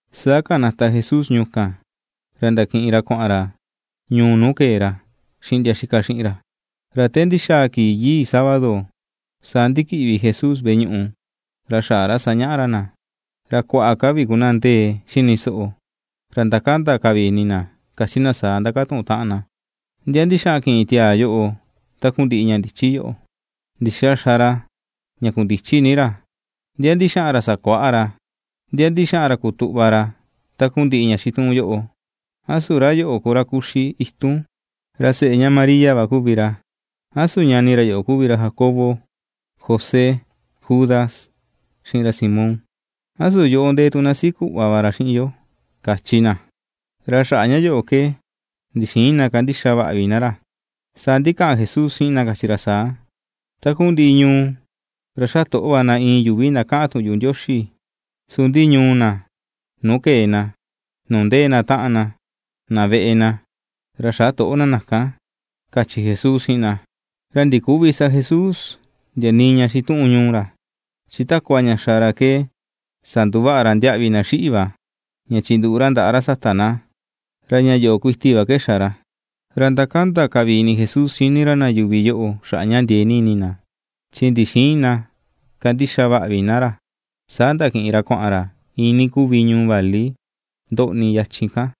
Saa kanata Jesús ñuu kan, ra ndakiꞌin ra kuaꞌan ra ñuu nuu kee ra, xiꞌin ndia itaꞌan xiꞌin ra. Ra te ndixaa kii yii, saa ndikiꞌvi Jesús ini veꞌe ñuꞌu, ra xaꞌa ra sañaꞌa ra na. Ra kuaꞌa ka vi ku na ndee xini soꞌo, ra ndakanda ka vi ini na kachi na saa ndakatuꞌun taꞌan na: ―¿Ndia ndixaꞌan kiꞌin tiaa yoꞌo takundiꞌi ña ndichi yoꞌo? ¿Ndixa xa ra ña kundichi ni ra? ¿Ndia ndixaꞌan ra sakuaꞌa ra? ¿Ndia ndixaꞌan ra kutuꞌva ra takundiꞌi ña xituꞌun yoꞌo? ¿A su ra yoꞌo ku ra kuxi itun, ra seꞌe ña María va kuvi ra? ¿A su ñani ra yoꞌo kuvi ra Jacobo, José, Judas, xiꞌin ra Simón? ¿A su yoꞌo ndee tu na siꞌi kuꞌva va ra xiꞌin yo? ―kachi na. Ra xaꞌa ña yoꞌo ke ndixïin na kandixa vaꞌa vi na ra. Saa ndikaꞌan Jesús xiꞌin na kachi ra saa: ―Takundiꞌi ñuu ra xatoꞌo va na iin yuvi na kaꞌan tuꞌun yuꞌu Ndioxi, su ndi ñuu na nuu kee na, nuu ndee na taꞌan na, na veꞌe na, ra xätoꞌo na na kan ―kachi Jesús xiꞌin na. Ra ndiküvi sa Jesús ndia nii ña xituꞌun ñuu ra, chi takua ña xa ra ke sanduvaꞌa ra ndiaꞌvi na xiꞌi̱ va, ña chinduꞌu ra ndaꞌa ra sata na, ra ña yoꞌo kuiti va ke xa ra. Ra ndakanda ka vi ini Jesús xini ra na yuvi yoꞌo xaꞌa ña ndiee ni ini na, chi ndixïin na kandixa vaꞌa vi na ra. Saa ndakiꞌin ra kuaꞌan ra iinii kuvi ñuu vali ndoꞌni yachin kan,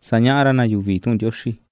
sañaꞌa ra na yuvi tuꞌun Ndioxi.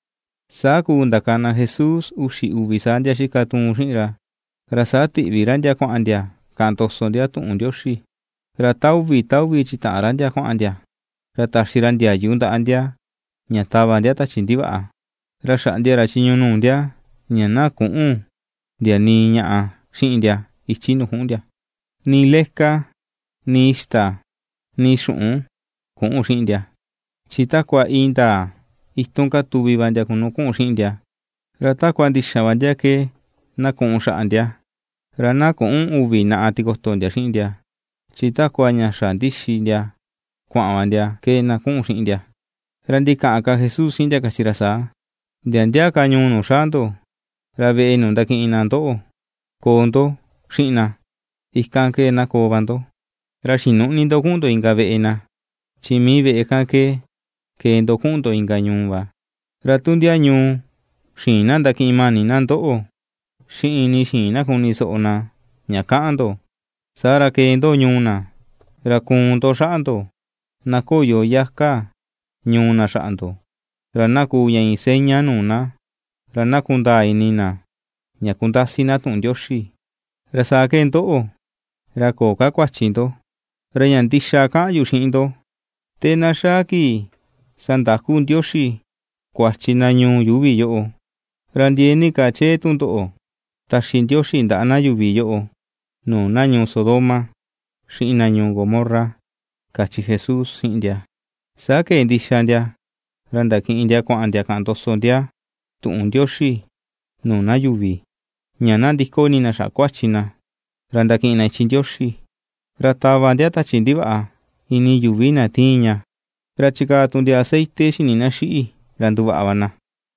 Saa kuu ndakana Jesús uxi uvi saa ndia itaꞌan tuun xiꞌin ra, ra saa tiꞌvi ra ndia kuaꞌan ndia kaꞌan ndoso ndia tuꞌun Ndioxi, ra ta uvi ta uvi chitaꞌan ra ndia kuaꞌan ndia, ra taxi ra ndiayu ndaꞌa ndia ña tava ndia tachi ndivaꞌa. Ra xaꞌndia ra chiñu nuu ndia ña na küꞌu̱n ndia nii ñaꞌa xiꞌin ndia ichi nuu ku̱ꞌu̱n ndia; nii leka, nii ixta, nii xuꞌun küꞌu̱n xiꞌin ndia, chi takua indaa itun katuvi va ndia ku nu ku̱ꞌu̱n xiꞌin ndia. Ra takua ndixan va ndia ke na ku̱ꞌu̱n xaꞌa ndia, ra na küꞌun uvi naꞌa tikoto ndia xiꞌin ndia, chi takua ña xa ndixi ndia kuaꞌan va ndia ke, na kuꞌun xiꞌin ndia. Ra ndikaꞌan ka Jesús xiꞌin ndia kachi ra saa: ―Ndia ndia ka ñuu nuu xaa ndo, ra veꞌe nuu ndakiꞌin na ndoꞌo koo ndo xiꞌin na; ikan ke na koo va ndo. Ra xinüꞌni ndo kuꞌun ndo inka veꞌe na, chi mii veꞌe kan ke kee ndo kuꞌun ndo inka ñuu va. Ra tu ndia ñuu xïin na ndakiꞌin mani na ndoꞌo, xiꞌin nii xïin na kunisoꞌo na ña kaꞌan ndo, saa ra kee ndo ñuu na, ra kuun ndo xaꞌa ndo na ko̱yo yaka ñuu na xaꞌa ndo, ra na kuu ña iin seña nuu na, ra na kundaa ini na ña kundasi na tuꞌun Ndioxi; ra saa ke ndoꞌo, ra köo ka kuachi ndo. Ra ña ndixa kaꞌan yu xiꞌin ndo, te na xaa kii sandaku Ndioxi kuachi na ñuu yuuvi yoꞌo, ra ndiee ni ka chee tundoꞌo taxi Ndioxi ndaꞌa na yuvi yoꞌo nuu na ñuu Sodoma, xiꞌin na ñuu Gomorra ―kachi Jesús xiꞌin ndia. Saa kee ndixa ndia ra ndakiꞌin ndia kuaꞌan ndia kaꞌan ndoso ndia tuꞌun Ndioxi nuu na yuvi, ña na ndiko ini na xaꞌa kuachi na ra ndakiꞌin na ichi Ndioxi. Ra tava ndia tachi ndivaꞌa ini yuvi na tiin ña, ra chikaa tu ndia aceite xi̱ni̱ na xiꞌi̱ ra nduvaꞌa va na.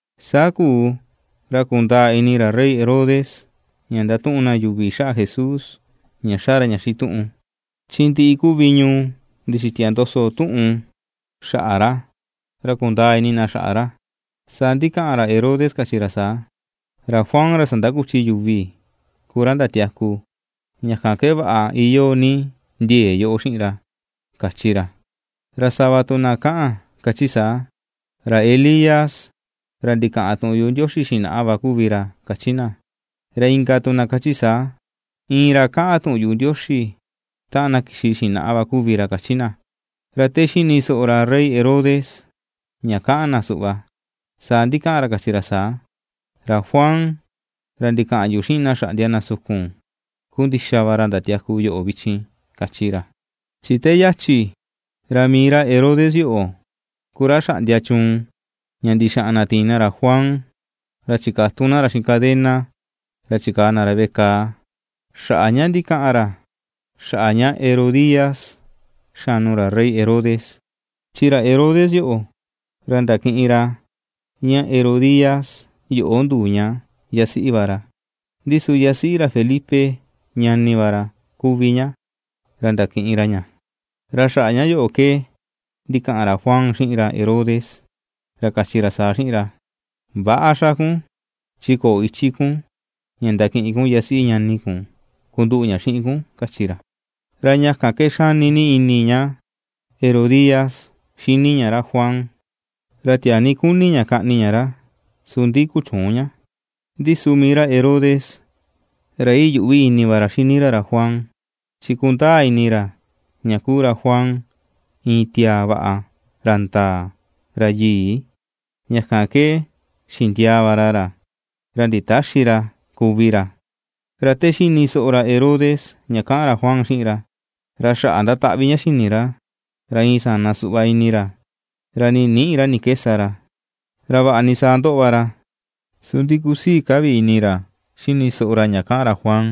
Saa kuu ra kundaa ini ra rey Herodes ña ndatuꞌun na yuvi xaꞌa Jesús ña xa ra ña xituꞌun. Chi ndiꞌi kuvi ñuu ndixitia ndoso tuꞌun xaꞌa ra, ra kundaa ini na xaꞌa ra. Saa ndikaꞌan ra Herodes kachi ra saa: ―Ra Juan ra sandakuchi yuvi ku ra ndatiaku. Ña kan ke vaꞌa iyoo ni ndie̱e̱ yoꞌo xiꞌin ra ―kachi ra. Ra sava tu na kaꞌan kachi saa: Ra Elías ra ndikaꞌan tuꞌun yuꞌu Ndioxi xinaꞌa va kuvi ra ―kachi na. Ra inka tu na kachi saa: ―Iin ra kaꞌan tuꞌun yuꞌu Ndioxi taꞌan na kixi xinaꞌa va kuvi ra ―kachi na. Ra te xini soꞌo ra Rey Herodes ña kaꞌan na suꞌva, saa ndikaꞌan ra kachi ra saa: ―Ra Juan, ra ndikaꞌan yu xiꞌin na xaꞌndia na sukun, ku ndixa va ra ndatiaku yoꞌo vichin ―kachi ra. Chi te yachi ra mii ra Herodes yoꞌo ku ra xaꞌndia chuun ña ndixaꞌan na tiin na ra Juan. Ra chikatun na ra xiꞌin cadena, ra chikaa na ra veꞌe kaa xaꞌa ña ndikaꞌan ra xaꞌa ña Herodías xanu ra rey Herodes, chi ra Herodes yoꞌo ra ndakiꞌin ra ña Herodías yoꞌo nduu ña yasiꞌi va ra. Ndi su yasiꞌi ra Felipe, ñani va ra, kuvi ña, ra ndakiꞌin ra ña. Ra xaꞌa ña yoꞌo ke ndikaꞌan ra Juan xiꞌin ra Herodes, ra kachi ra saa xiꞌin ra: ―Väꞌa xa kun, chi köo ichi kun ña ndakiꞌin kun yasiꞌi ñani kun kunduꞌu ña xiꞌin kun ―kachi ra. Ra ña kan ke xani ni ini ña Herodías xini ña ra Juan, ra tiaa ni kuni ña kaꞌni ña ra, su ndi kuchüun ña. Ndi su mii ra Herodes ra iyuꞌvi ini va ra xini ra ra Juan, chi kundaa ini ra ña kuu ra Juan iin tiaa vaꞌa, ra ndaa, ra yii; ña kan ke xindiaa va ra ra, ra nditäxi ra kuvi ra. Ra te xini soꞌo ra Herodes ña kaꞌan ra Juan xiꞌin ra, ra xaꞌa ndataꞌvi ña xi̱ni̱ ra, ra iin sana suꞌva ini ra, ra nii nïꞌi ra ni ke sa ra, ra vaꞌa ni saa ndo̱ꞌo va ra, su ndi kusii ka vi ini ra xini soꞌo ra ña kaꞌan ra Juan.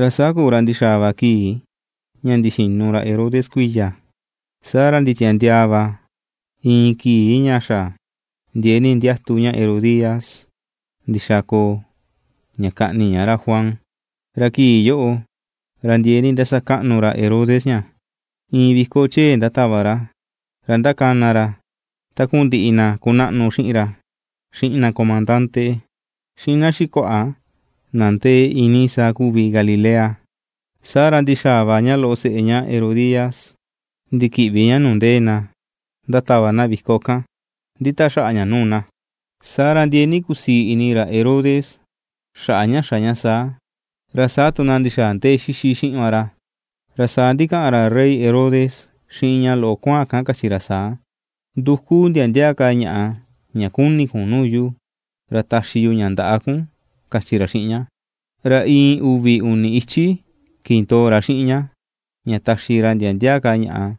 Ra saa kuu ra ndi̱xa̱a̱ va kii ña ndixinu ra Herodes kuiya, saa ra nditiandiaa va iin kii ña xa ndiee ni ndiatu ña Herodías ndixa koo ña kaꞌni ña ra Juan. Ra kii yoꞌo ra ndiee ni ndasakaꞌnu ra Herodes ña, iin viko chee ndatava ra, ra ndakana ra takundiꞌi na kunaꞌnu xiꞌin ra, xiꞌin na komandande, xiꞌin na xikuaꞌa na ndee iinii saa kuvi Galilea. Saa ra ndixaa va ña loꞌo seꞌe ña Herodías ndikiꞌvi ña nuu ndee na ndatava na viko kan nditaxaꞌa ña nuu na. Saa ra ndiee ni kusii ini ra Herodes xaꞌa ña xa ña saa, ra saa tu na ndixaa ndee xixi xiꞌin va ra. Ra saa ndikaꞌan ra rey Herodes xiꞌin ña loꞌo kuaan kan kachi ra saa: ―Nduku ndia ndia ka ñaꞌa ña kuni̱ kun nuu yu, ra taxi yu ña ndaꞌa kun ―kachi ra xiꞌin ña. Ra iin uvi uni ichi kindoo ra xiꞌin ña, ña taxi ra ndia ndia ka ñaꞌa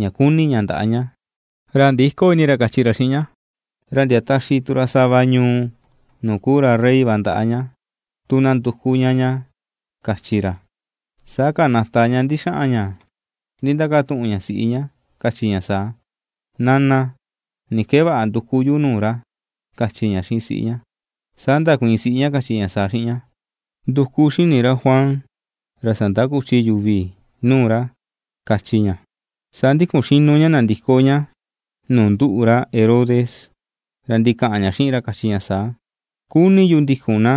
ña kuni ña ndaꞌa ña, ra ndïko ini ra kachi ra xiꞌin ña, ra ndia taxi tu ra sava ñuu nuu kuu ra rey va ndaꞌa ña, tu na nduku ña ña, kachi ra. Saa kanata ña ndixaꞌan ña ndindakatuꞌun ña siꞌi ña kachi ña saa: ―Nana, ¿ni ke vaꞌa nduku yu nuu ra ―kachi ña xiꞌin siꞌi ña. Saa ndakuiin siꞌi ña kachi ña saa xiꞌin ña: ―Nduku xi̱ni̱ ra Juan ra sandakuchi yuvi nuu ra ―kachi ña. Saa ndikun xinu ña nandiko ña nuu ndúꞌu̱ ra Herodes, ra ndikaꞌan ña xiꞌin ra kachi ña saa: ―Kuni yu ndikun na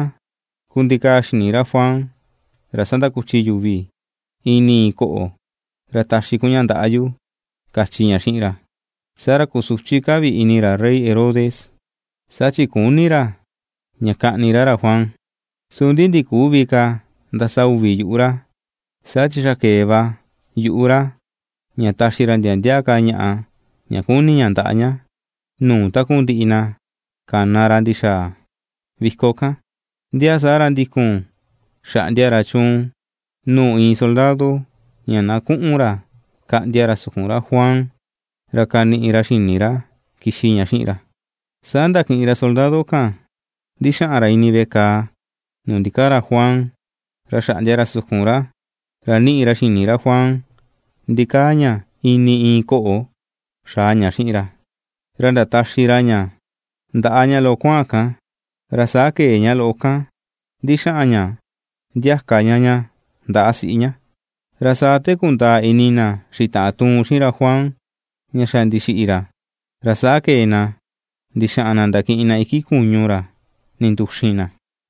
kundikaa xini ra Juan ra sandakuchi yuvi ini iin ko̱ꞌo̱, ra taxi kun ña ndaꞌa yu ―kachi ña xiꞌin ra. Saa ra kusuchi ka vi ini ra rey Herodes, saa chi küni ra ña kaꞌni ra ra Juan, su ndi ndiküvi ka ndasa uvi yuꞌu ra, saa chi xa kee va yuꞌu ra ña taxi ra ndia ndia ka ñaꞌa ña kuni ña ndaꞌa ña, nuu takundiꞌi na kana ra ndi̱xa̱a̱ viko kan. Ndia saa ra ndikun xaꞌndia ra chuun nuu iin soldado ña na kuꞌun ra kaꞌndia ra sukun ra Juan, ra kaniꞌi ra xini ra, kixi ña xiꞌin ra. Saa ndakiꞌin ra soldado kan ndixaꞌan ra ini veꞌe kàà nuu ndikaa ra Juan, ra xaꞌndia ra sukun ra, ra niꞌi ra xini ra Juan ndikaa ña ini iin ko̱ꞌo̱ xaa ña xiꞌin ra, ra ndataxi ra ña ndaꞌa ña loꞌo kuaan kan, ra saa ke̱e ña loꞌo kan ndixaꞌan ña ndiaka ña ña ndaꞌa siꞌi ña. Ra saa te kundaa ini na xitaꞌan tuun xiꞌin ra Juan ña xa ndixiꞌi ra, ra saa ke̱e na ndixaꞌan na ndakiꞌin na iki kuñu ra ndinduxin na.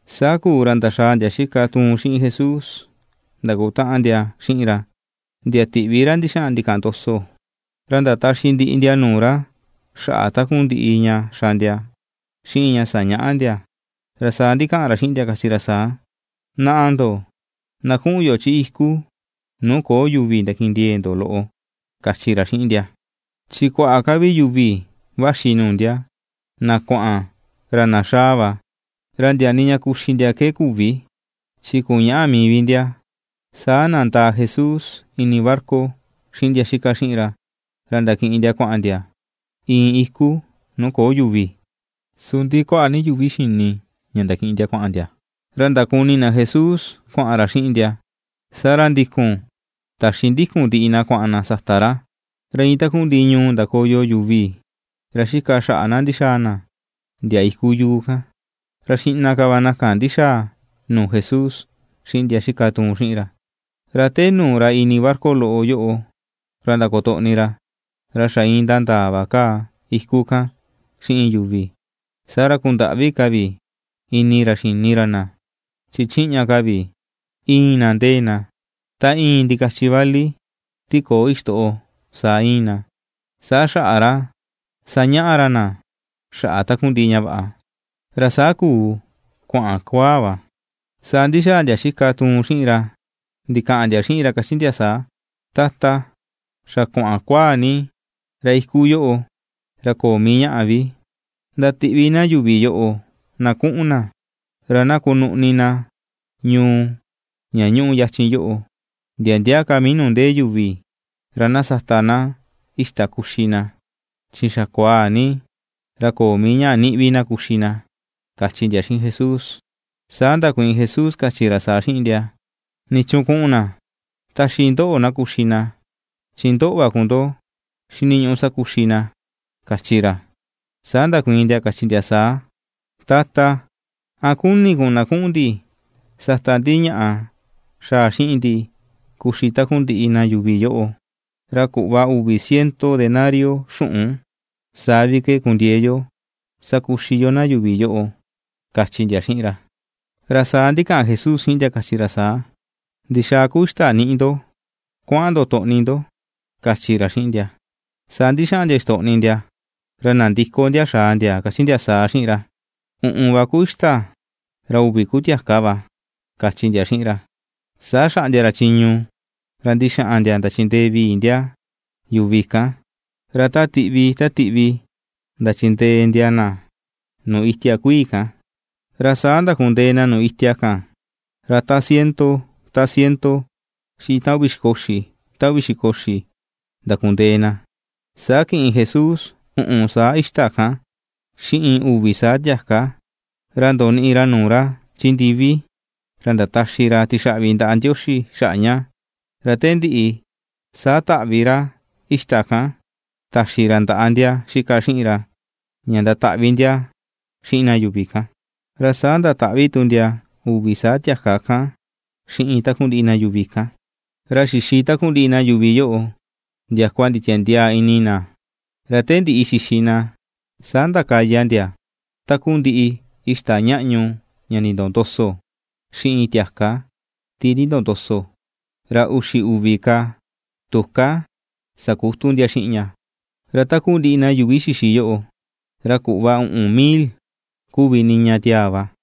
Saa kuu ra ndaxàà ndia itaꞌan tuun xiꞌin Jesús, ndakutaꞌan ndia xiꞌin ra, ndia tiꞌvi ra ndixaꞌan ndikaꞌan ndoso, ra ndataxi ndiꞌi ndia nuu ra xaꞌa takundiꞌi ña xa ndia, xiꞌin ña sañaꞌa ndia. Ra saa ndikaꞌan ra xiꞌin ndia kachi ra saa: ―Naꞌa ndo, na kuꞌun yo chi iku nuu köo yuvi ndakindiee ndo loꞌo ―kachi ra xiꞌin ndia. Chi kuaꞌa ka vi yuvi vaxi nuu ndia; na kuaꞌan, ra na xaa va, ra ndia nii ña kuxi ndia ke küvi, chi kuñäꞌa mii vi ndia. Saa nandaa Jesús ini barca xiꞌin ndia xika xiꞌin ra, ra ndakiꞌin ndia kuaꞌan ndia iin iku nuu köo yuvi. Su ndi kuaꞌa ni yuvi xini ña ndakiꞌin ndia kuaꞌan ndia, ra ndakuni na Jesús kuaꞌan ra xiꞌin ndia. Saa ra ndikun taxindikun ndiꞌi na kuaꞌan na sata ra, ra iin takundiꞌi ñuu ndakoyo yuvi ra xika xaꞌa na ndixaa na ndia iku yuu kan, ra xiꞌna ka va na kan ndixaa nuu Jesús xiꞌin ndia xika tuun xiꞌin ra. Ra te nuu ra ini barca loꞌo yoꞌo ra ndakotoꞌni ra, ra xa iin ndandaa va kaa iku kan xiꞌin yuvi, saa ra kundaꞌvi ka vi ini ra xini ra na, chin chiꞌña ka vi íin na ndee na, ta iin ndikachi vali ti köo ixtoꞌo saa íin na. Saa xaꞌa ra sañaꞌa ra na xaꞌa takundiꞌi ña vaꞌa. Ra saa kuu kuaꞌan kuaa va, saa ndi̱xaa ndia xika tuun xiꞌin ra ndikaꞌan ndia xiꞌin ra kachi ndia saa: ―Tata, xa kuaꞌan kuaa ni, ra iku yoꞌo ra köo mii ñaꞌa vi. Ndatiꞌvi na yuvi yoꞌo na kuꞌun na, ra na kunuꞌni na ñuu ña ñuꞌu yachin yoꞌo, ndia ndia ka mii nuu ndee yuvi, ra na sata na ixta kuxi na, chi xa kuaa ni, ra köo mii ñaꞌa niꞌi na kuxi vi na ―kachi ndia xiꞌin Jesús. Saa ndakuiin Jesús kachi ra saa xiꞌin ndia: ―¿Nichuun kuꞌun na? Taxi ndoꞌo na kuxi na, chi ndoꞌo va ku ndo xiniñuꞌu sakuxi na ―kachi ra. Saa ndakuiin ndia kachi ndia saa: ―Tata, ¿a kuni kun na kuꞌun ndi sata ndi ñaꞌa xaa xiꞌin ndi kuxi takundiꞌi na yuvi yoꞌo? Ra kuꞌva uvi ciento denario xuꞌun, saa vi ke kundiee yo sakuxi yo na yuvi yoꞌo ―kachi ndia xiꞌin ra. Ra saa ndikaꞌan Jesús xiꞌin ndia, kachi ra saa: ―¿Ndixaa ku ixta niꞌi ndo? Kuaꞌan ndo toꞌni ndo ―kachi ra xiꞌin ndia. Saa ndixaꞌan ndia ixtoꞌni ndia, ra nandiko ndia xaa ndia kachi ndia saa xiꞌin ra: ―Uꞌun va ku ixta, ra uvi ku tiaka va ―kachi ndia xiꞌin ra. Saa xaꞌndia ra chiñu ra ndixaꞌan ndia ndachindee vii ndia yuvi kan, ra ta tiꞌvi ta tiꞌvi ndachindee ndia na nuu itia kuii̱ kan. Ra saa ndakundee na nuu itia kan, ra ta ciento ta ciento, xiꞌin ta uvi xiko uxi, ta uvi xiko uxi ndakundee na. Saa kiꞌin Jesús uꞌun saa ixta kan, xiꞌin uvi saa tiaka, ra ndoniꞌi ra nuu ra chi ndivi, ra ndataxi ra tixaꞌvi ndaꞌa Ndioxi xaꞌa ña, ra te ndiꞌi, saa taꞌvi ra ixta kan taxi ra ndaꞌa ndia xika xiꞌin ra, ña ndataꞌvi ndia xiꞌin na yuvi kan, ra saa ndataꞌvi tu ndia uvi saa tiaka kan xiꞌin takundiꞌi na yuvi kan. Ra xixi takundiꞌi na yuvi yoꞌo ndiakua nditiandiaa ini na. Ra te ndiꞌi xixi na, saa ndakaya ndia takundiꞌi ixta ñaꞌñu ña nindoo ndoso, xiꞌin tiaka ti nindoo ndoso, ra uxi uvi ka tuká sakutu ndia xiꞌin ña. Ra takundiꞌi na yuvi xixi yoꞌo, ra kuꞌva uꞌun mil kuvi niña tiaa va.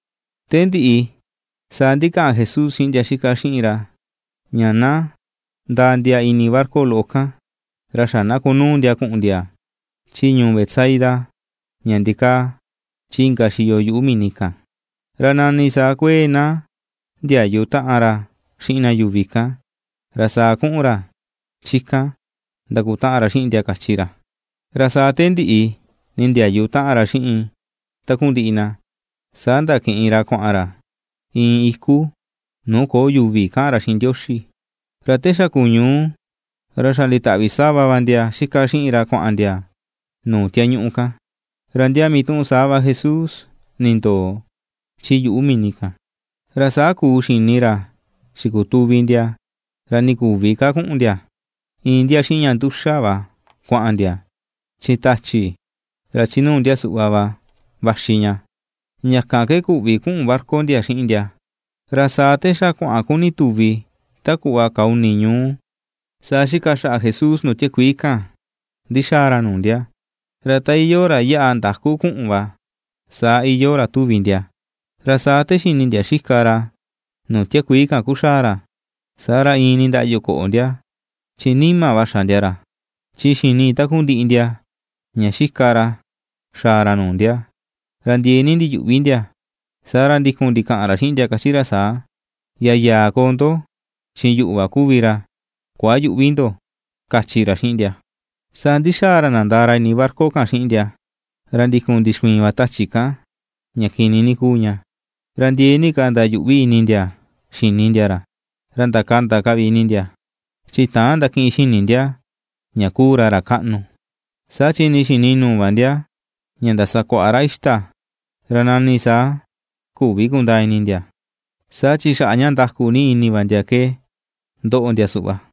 Te ndiꞌi, saa ndikaꞌan Jesús xiꞌin ndia xika xiꞌin ra ña na ndaa ndia ini barca loꞌo kan, ra xa na kunuu ndia kuꞌun ndia chi ñuu Betsaida ña ndikaa chi inka xiyo yuꞌu mini kan, ra nani saa kuee na ndiayu taꞌan ra xiꞌin na yuvi kan, ra saa kuꞌun ra chi kan ndakutaꞌan ra xiꞌin ndia, kachi ra. Ra saa te ndiꞌi nindiayu taꞌan ra xiꞌin takundiꞌi na, saa ndakiꞌin ra kuaꞌan ra iin iku nuu köo yuvi ña kaꞌan ra xiꞌin Ndioxi. Ra te xa kuñuu, ra xa nditaꞌvi sava va ndia xika xiꞌin ra kuaꞌan ndia nuu tiañuꞌu kan, ra ndia mituꞌun saa va Jesús nindoo chi yuꞌu mini kan. Ra saa kuu xini ra xikutuvi ndia ra nii küvi ka kuꞌun ndia, iin ndia xiꞌin ña nduxa va kuaꞌan ndia, chi tachi ra chi nuu ndia suꞌva va vaxi ña, ña kan ke küvi kuꞌun barca ndia xiꞌin ndia. Ra saa te xa kuaꞌan kuni̱ tu̱vì ta kuꞌva kaa uni ñuu, saa xika xaꞌa Jesús nuu tiakuii kan ndixaa ra nuu ndia, ra ta iyoo ra yaꞌa ndaku kuꞌun va, saa iyoo ra tuvi ndia. Ra saa te xini ndia xika ra nuu tiakuii kan kuxaa ra, saa ra iin nindaꞌyu ko̱ꞌo̱ ndia, chi nima va xa ndia ra. Chi xini takundiꞌi ndia ña xika ra xaa ra nuu ndia, ra ndiee ni ndiyuꞌvi ndia. Saa ra ndikun ndikaꞌan ra xiꞌin ndia kachi ra saa: ―¡Yayaa koo ndo chi yuꞌu va kuvi ra! Kuayüꞌvi ndo ―kachi ra xiꞌin ndia. Saa ndixaa ra nandaa ra ini barca kan xiꞌin ndia, ra ndikun ndixkuiin va tachi kan ña kini ni kuu ña. Ra ndiee ni ka ndayuꞌvi ini ndia xini ndia ra, ra ndakanda ka vi ni ndia. Chi täan ndakiꞌin xini ndia ña kuu ra, ra kaꞌnu, saa chi nii xi̱ni̱ nuu va ndia ña ndasakuaꞌa ra ixta, ra nani saa küvi kundaa ini ndia, saa chi xaꞌa ña ndaku ni ini va ndia ke ndoꞌo ndia suꞌva.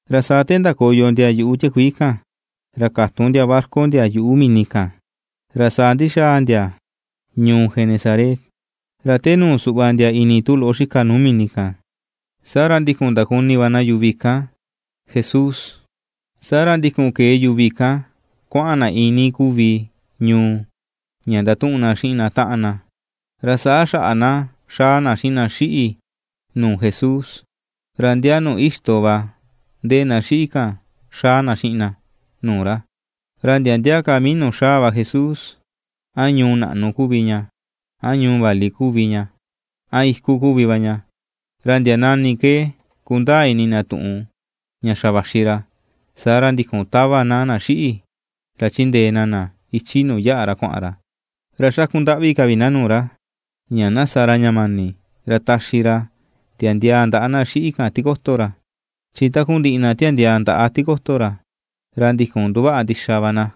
Ra saa te ndakoyo ndia yuꞌu tiakuii kan, ra katun ndia barca ndia yuꞌu mini kan, ra saa ndixaa ndia ñuu Genesaret. Ra te nu̱ù suꞌva ndia ini tu loꞌo xika nuu mini kan, saa ra ndikun ndakuni va na yuvi kan Jesús. Saa ra ndikun kee yuvi kan kuaꞌan na iinii kuvi ñuu ña ndatuꞌun na xiꞌin na taꞌan na, ra saa xaꞌa na xaa na xiꞌin na xiꞌi̱ nuu Jesús ra ndia nuu ixto va ndee na xiꞌi̱ kan, xaa na xiꞌin na nuu ra. Ra ndia ndia ka mii nuu xaa va Jesús, a ñuu naꞌnu kuvi ña, a ñuu vali kuvi ña, a iku kuvi va ña, ra ndia nani ke kundaa ini na tuꞌun ña xa vaxi ra, saa ra ndikun tava va na na xiꞌi̱ ra chindee na na ichi nuu yaꞌa ra kuaꞌan ra, ra xakundaꞌvi ka vi na nuu ra, ña na sa ra ña mani ra taxi ra tiandiaa ndaꞌa na xiꞌi̱ kan tikoto ra. Chi takundiꞌi na tiandiaa ndaꞌa tikoto ra, ra ndikun nduvaꞌa ndixa va na.